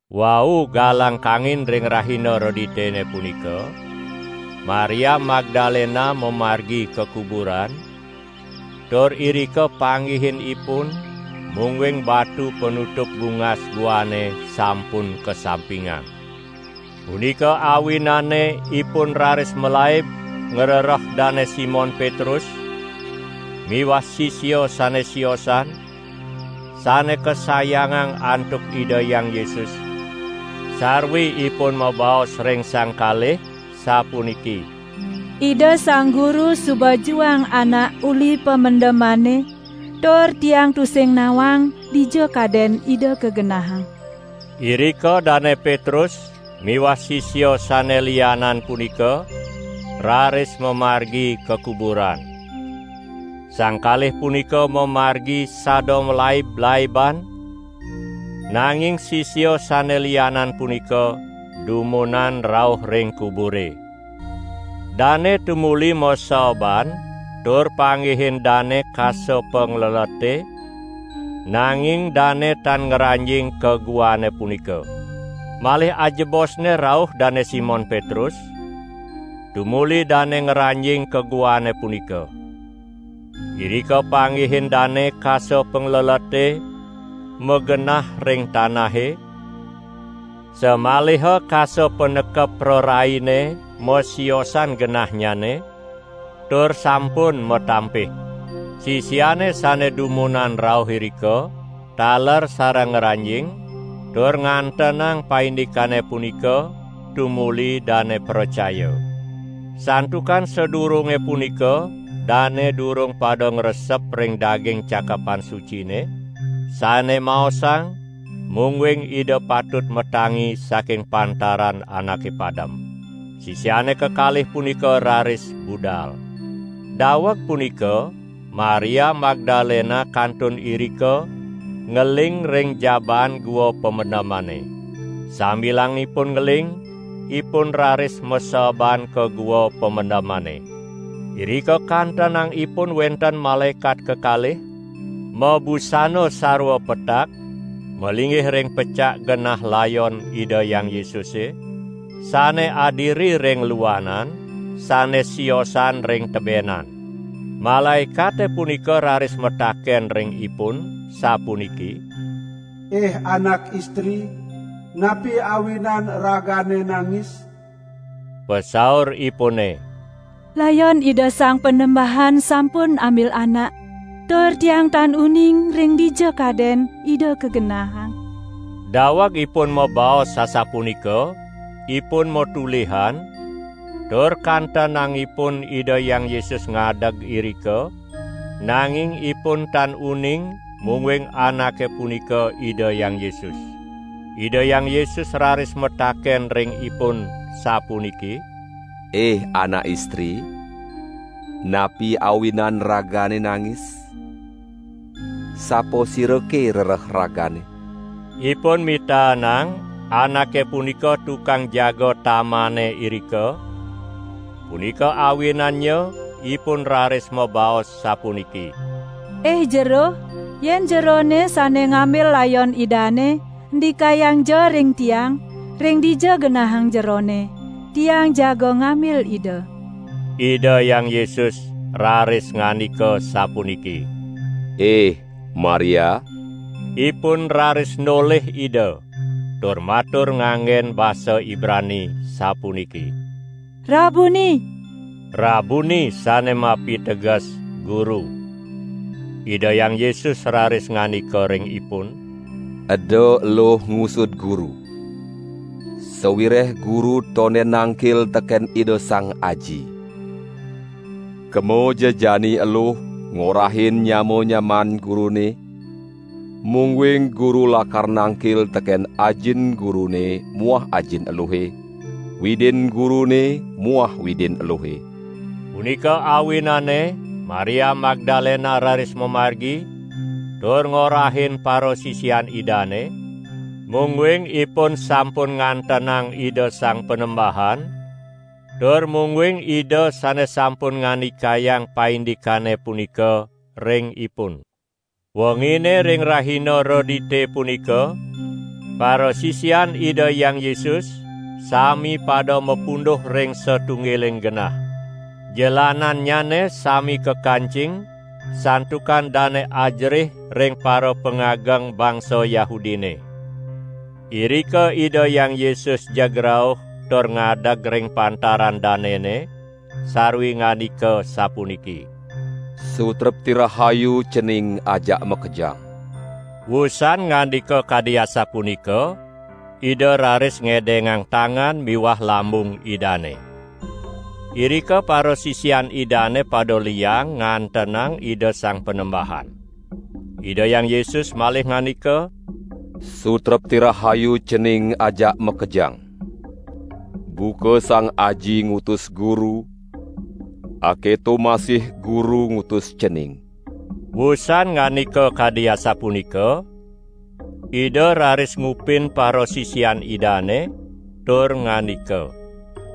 Wau galang kangin ring rahina Reditene punika, Maria Magdalena mamargi ka kuburan, tur irika panggihin ipun, mungguing batu panutup bungas guane sampun kasampingang. Punika awinane ipun raris malaib ngrereh Dane Simon Petrus miwah sisia sane siosan, sane kasayangang antuk Ida Hyang Yesus sarwi ipun mabaos ring sang kalih sapuniki: "Ida Sang Guru suba juang anak uli pamendemane tur tiang tusing nawang dija kaden Ida kagenahang." Irika Dane Petrus miwah sisia sane lianan punika raris mamargi ka kuburan. Sang kalih punika mamargi sada malaib-laiban nanging sisia sane lianan punika dumunan rauh ring kubure. Dane tumuli maseeban tur panggihin dane kasa panglelete, nanging dane tan ngranjing ka guane punika. Malih ajebosne rauh Dane Simon Petrus, tumuli dane ngranjing ka guane punika. Irika panggihin dane kasa panglelete magenah ring tanahe, samaliha kasa panekep praraine masiosan genahnyane tur sampun matampih. Sisiane sane dumunan rauh irika, taler sareng ngranjing, tur ngantenang paindikane punika tumuli dane pracaya. ( Santukan sadurunge punika dane durung pada ngresep ring daging Cakepan Sucine, sane maosang, mungguing Ida patut matangi saking pantaran anake padem.) Sisiane kekalih punika raris budal. Daweg punika Maria Magdalena kantun irika ngeling ring jabaan gua pamendemane. Sambilang ipun ngeling, ipun raris maseeban ka gua pamendemane. Irika kantenang ipun wenten malaekat kekalih, mabusana sarwa petak malinggih ring pecak genah layon Ida Hyang Yesuse, sane adiri ring luanan sane siosan ring tebenan. Malaekate punika raris mataken ring ipun sapuniki: "Ih anak istri, napi awinan ragane nangis?" Pasauripune: "Layon Ida Sang Panembahan sampun ambil anak, tur tiang tan uning ring dija kaden Ida kagenahang!" Daweg ipun mabaos asapunika ipun matolihan, tur kantenang ipun Ida Hyang Yesus ngadeg irika; nanging ipun tan uning mungguing Anake punika Ida Hyang Yesus. Ida Hyang Yesus raris mataken ring ipun sapuniki: "Ih anak istri, napi awinan ragane nangis? Sapasirake rereh ragane?" Ipun mitaenang Anake punika tukang jaga tamane irika, punika awinannya ipun raris mabaos sapuniki: "Ih Jero, yen Jerone sane ngambil layon Idane, ndikayangja ring tiang, ring dija genahang Jerone. Tiang jaga ngambil Ida!" Ida Hyang Yesus raris ngandika sapuniki: "Ih Maria!" Ipun raris nolih Ida tur matur nganggen basa Ibrani sapuniki: "Rabuni!" (Rabuni sane mapiteges: "Guru".) Ida Hyang Yesus raris ngandika ring ipun: "Eda eluh ngusud Guru! Sawireh Guru tonden nangkil teken Ida Sang Aji. Kemaja jani eluh ngorahin nyama-nyamaan Gurune mungguing Guru lakar nangkil teken Ajin Gurune muah Ajin eluhe, Widin Gurune muah Widin eluhe!" Punika awinane Maria Magdalena raris mamargi tur ngorahin parasisian Idane, mungguing ipun sampun ngantenang Ida Sang Panembahan tur mungguing Ida sane sampun ngandikayang paindikane punika ring ipun. Wengine ring rahina Redite punika parasisian Ida Hyang Yesus sami pada mapunduh ring satunggiling genah. Jelanannyane sami kakancing santukan dane ajerih ring parapangageng bangsa Yahudine. Irika Ida Hyang Yesus jeg rauh tur ngadeg ring pantaran danene sarwi ngandika sapuniki: "Sutrepti rahayu cening ajak makejang!" Wusan ngandika kadi asapunika Ida raris ngedengang tangan miwah lambung Idane. Irika parasisian Idane pada liang ngantenang Ida Sang Panembahan. Ida Hyang Yesus malih ngandika: "Sutrepti rahayu cening ajak makejang. Buka Sang Aji ngutus Guru, aketo masih Guru ngutus cening." Wusan ngandika kadi asapunika, Ida raris ngupin parasisian Idane tur ngandika: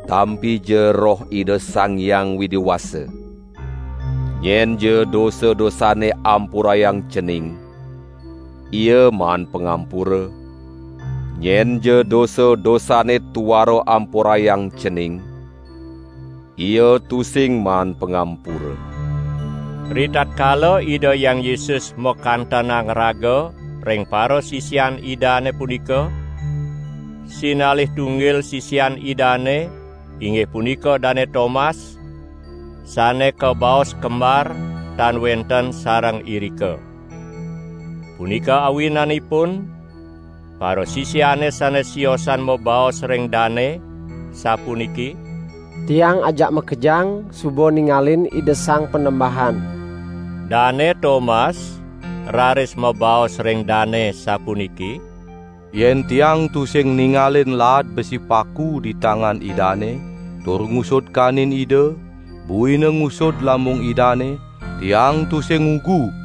"Tampija Roh Ida Sang Hyang Widi Wasa. Nyenja dosa-dosanne ampurayang cening, ia maan pangampura; nyenja dosa-dosanne tuara ampurayang cening, ia tusing maan pangampura!" Ritatkala Ida Hyang Yesus makantenang raga ring parasisian Idane punika, sinalih tunggil sisian Idane, inggih punika Dane Tomas, sane kabaos Kembar tan wenten sareng irika. Punika awinanipun parasisiane sane siosan mabaos ring dane sapuniki: "Tiang ajak makejang suba ningalin Ida Sang Panembahan." Dane Tomas raris mabaos ring dane sapuniki: "Yen tiang tusing ningalin laad besi paku di tangan Idane tur ngusud kanin Ida, buina ngusud lambung Idane, tiang tusing ngugu!"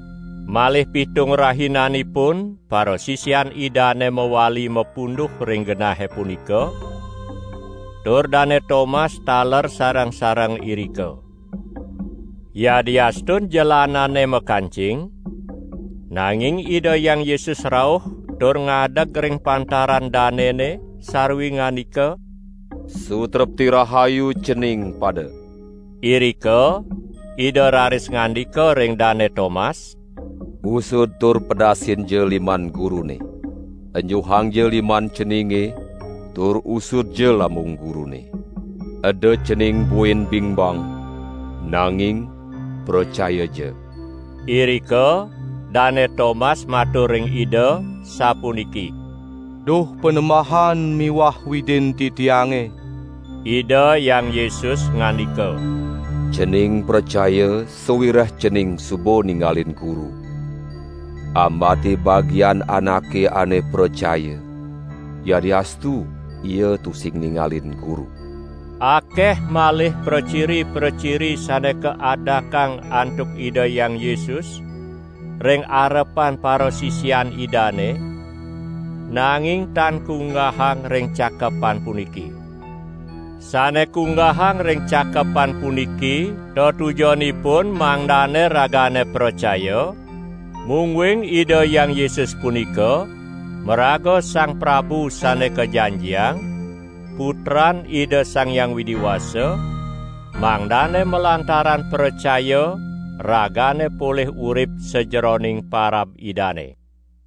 Malih pitung rahinanipun parasisian Idane mawali mapunduh ring genahe punika, tur Dane Tomas taler sareng-sareng irika. Yadiastun jelanane makancing, nanging Ida Hyang Yesus rauh tur ngadeg ring pantaran danene sarwi ngandika: "Sutrepti rahayu cening pada!" Irika Ida raris ngandika ring Dane Tomas: "Usud tur pedasinja liman Gurune, enjuhangja liman ceninge tur usudja lambung Gurune. Eda cening buin bingbang, nanging pracayaja!" Irika Dane Tomas matur ring Ida sapuniki: "Duh Panembahan miwah Widin titiange!" Ida Hyang Yesus ngandika: "Cening pracaya sawireh cening suba ningalin Guru. Ambate bagian anake ane pracaya yadiastu ia tusing ningalin Guru!" Akeh malih praciri-praciri sane kaadakang antuk Ida Hyang Yesus ring arepan parasisian Idane, nanging tan kunggahang ring cakepan puniki. Sane kunggahang ring cakepan puniki tetujonipun mangdane ragane pracaya mungguing Ida Hyang Yesus punika maraga Sang Prabu Sane Kajanjiang, Putran Ida Sang Hyang Widi Wasa, mangdane malantaran pracaya ragane polih urip sajeroning parab Idane.